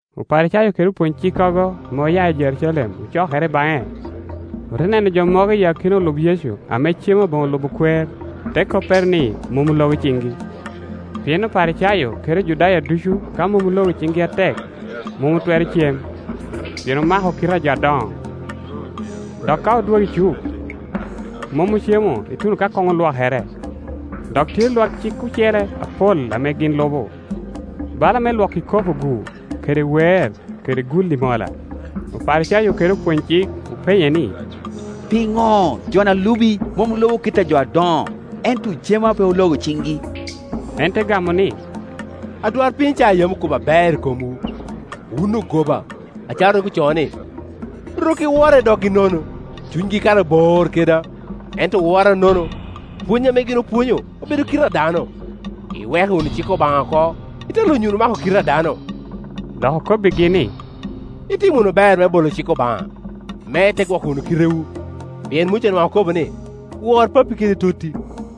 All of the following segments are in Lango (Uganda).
Oparicayo kede opwony-cikkogo ame oya i Jerucalem ocokere baŋe. Ote neno jo mogo i akina olub Yecu ame cemo aboŋo lubo kwer, te koppere ni mom ologo ciŋgi. (Pien Oparicayo kede Ojudaya ducu ka mom ologo ciŋgi atek, mom otwero cem, pien oma-ko kite a jo adoŋo. Dok ka odwogo i cuk, mom ocemo ituno ka koŋ olwokere; dok tye lwak cik ocele apol ame gin lubo, bala me lwoko ikopo-gu, kede weer, kede gulli mola.) Oparicayo kede opwony-cik openye ni, “Piŋo joni a lubi mom lubo kit a jo adoŋo, ento ocemo a pe ologo ciŋgi?” En te gamo ni, “Adwarpiny Icaya yam okobo aber i komwu, wun ogoba, acalo rik ocoo ni, ‘Rok-k i wora i doggi nono, cunygi kara bor keda; ento owora nono, pwony ame gin opwonyo obedo kite a dano.’ Iweko wunu cik Obaŋa oko, ite lunyo wunu mako kite a dano.” Dok okobbigi ni, “Itimo wunu ber me bolo cik Obaŋa, me ite gwoko wunu kitewu! Pien Muca nwaŋ okobo ni, ‘Wor pappi kede totti,’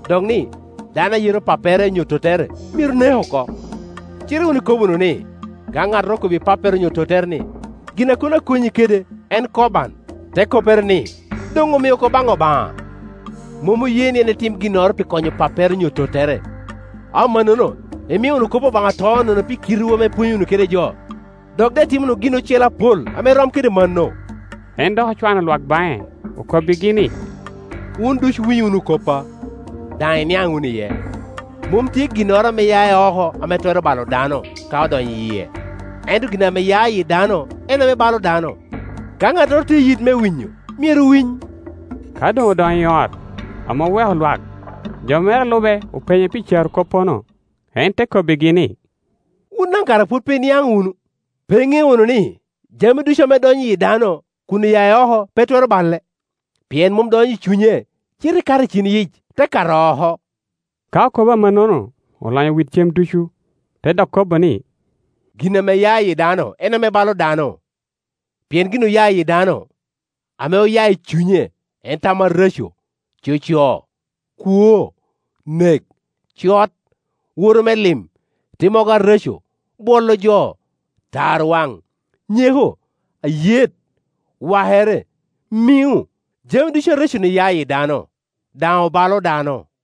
dok ni, ‘Dano a yeto pappere onyo tottere myero nek oko’. Cite wun ikobo wunu ni, ‘Ka ŋattoro okobbi pappere onyo tottere ni, Gin a kono akonyi kede en Korban’ (te koppere ni, doŋ omio oko baŋ Obaŋa), mom oye ni en tim ginnoro pi konyo pappere onyo tottere. Amannono imio wunu kop Obaŋa to nono pi kitewu ame ipwonyo wunu kede jo. Dok daŋ itimo wunu gin ocele apol ame rom kede mano.” En dok ocwano lwak baŋe, okobbigi ni, “Wun ducu winy wunu koppa, daŋ iniaŋ wunu iye. Mom tye ginnoro ame ya i oko ame twero balo dano ka odonyo i yie; ento gin ame ya i yi dano en ame balo dano. [ Ka ŋattoro tye i yit me winyo, myero winy.]” Ka doŋ odonyo i ot, ame oweko lwak, jo mere a lube openye pi carokoppono. En te kobbigi ni, “Wun daŋ kara pwod pe iniaŋ wunu? Pe iŋeo wunu ni, jami ducu ame donyo i yi dano kun oya i oko pe twero bale? Pien mom donyo i cunye, cite kato i cin-yic, te kato oko.” (Ka okobo amannono, olonyo wit cem ducu.) Te dok kobo ni, “Gin ame ya i yi dano en ame balo dano. Pien gin oya i yi dano, ame oya i cunye, en tam areco, coco, kwo, nek, cot, woro me lim, timmogo areco, bwolo jo, tarwaŋ, nyeko, ayet, wakere, miŋo. Jami ducu arecc-ni ya i yi dano, daŋ obalo dano.”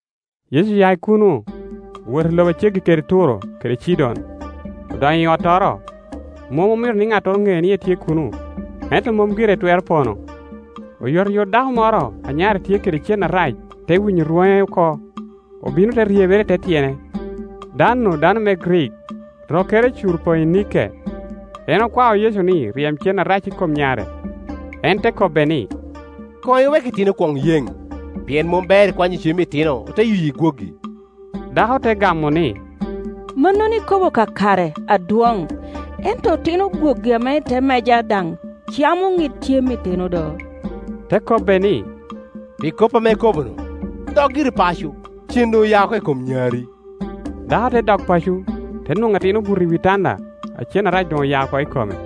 Yecu oya i kuno, owoto i lobo a ceggi kede Turo kede Cidon. Odonyo i ottoro, mom omito ni ŋattoro ŋe ni etye kuno; ento mom gire etwero pono. Oyotoyot dako moro a nyare tye kede cen arac te winyo rwoŋe oko, obino te ryebere i te tyene. Dan-nu dano me Grik, rokkere Curo-poinike. En okwao Yecu ni ryem cen arac i kom nyare. En te kobbe ni, “Koŋ iwek itino kwoŋ yeŋ, pien mom ber ikwanyo cem itino, ote yuyi gwogi.” Dako te gamo ni, “Mannono ikobo kakare, Adwoŋ; ento otino gwogi ame i te meja daŋ camo ŋid cem itino do.” Te kobbe ni, “Pi kop ame ikobo-nu, dok giri paco; cen doŋ oya oko i kom nyari.” Dako te dok paco; te nwoŋo atin obuto i wi tanda, a cen arac doŋ oya oko i kome.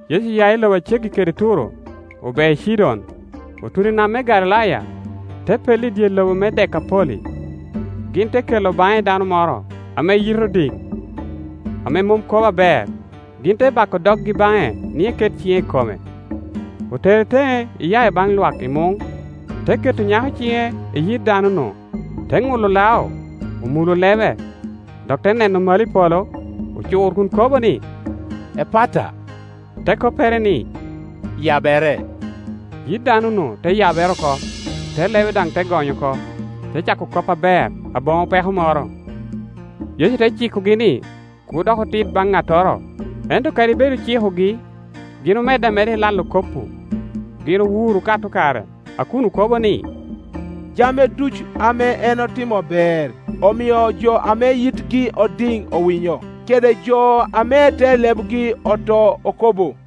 Yecu oya i lobo a ceggi kede Turo, obeo i Cidon, otuno i nam me Galilaya, te pello i dye lobo me Dekapoli. Gin te kela baŋe dano moro ame yite odiŋ, ame mom kobo aber, gin te bako doggi baŋe ni eket ciŋe i kome. Otere teŋe iya i baŋ lwak i muŋ, te keto nyako ciŋe i yit dano-nu, te ŋulo lao, omulo lebe; dok te neno malo i polo, ocur kun kobo ni, “Epata,” te koppere ni, “Yabere!” Yit dano-nu te yabere oko, te lebe daŋ te gony oko, te cako kop aber, aboŋo peko moro. Yecu te cikogi ni, kur dok otit baŋ ŋattoro; ento kadi bed ocikogi, gin omedde omeda i lalo kop-pu. Gin owuro okato kare a kun okobo ni, “Jami ducu ame en otimo ber; omio jo ame yitgi odiŋ owinyo, kede jo ame te lebgi oto okobo.”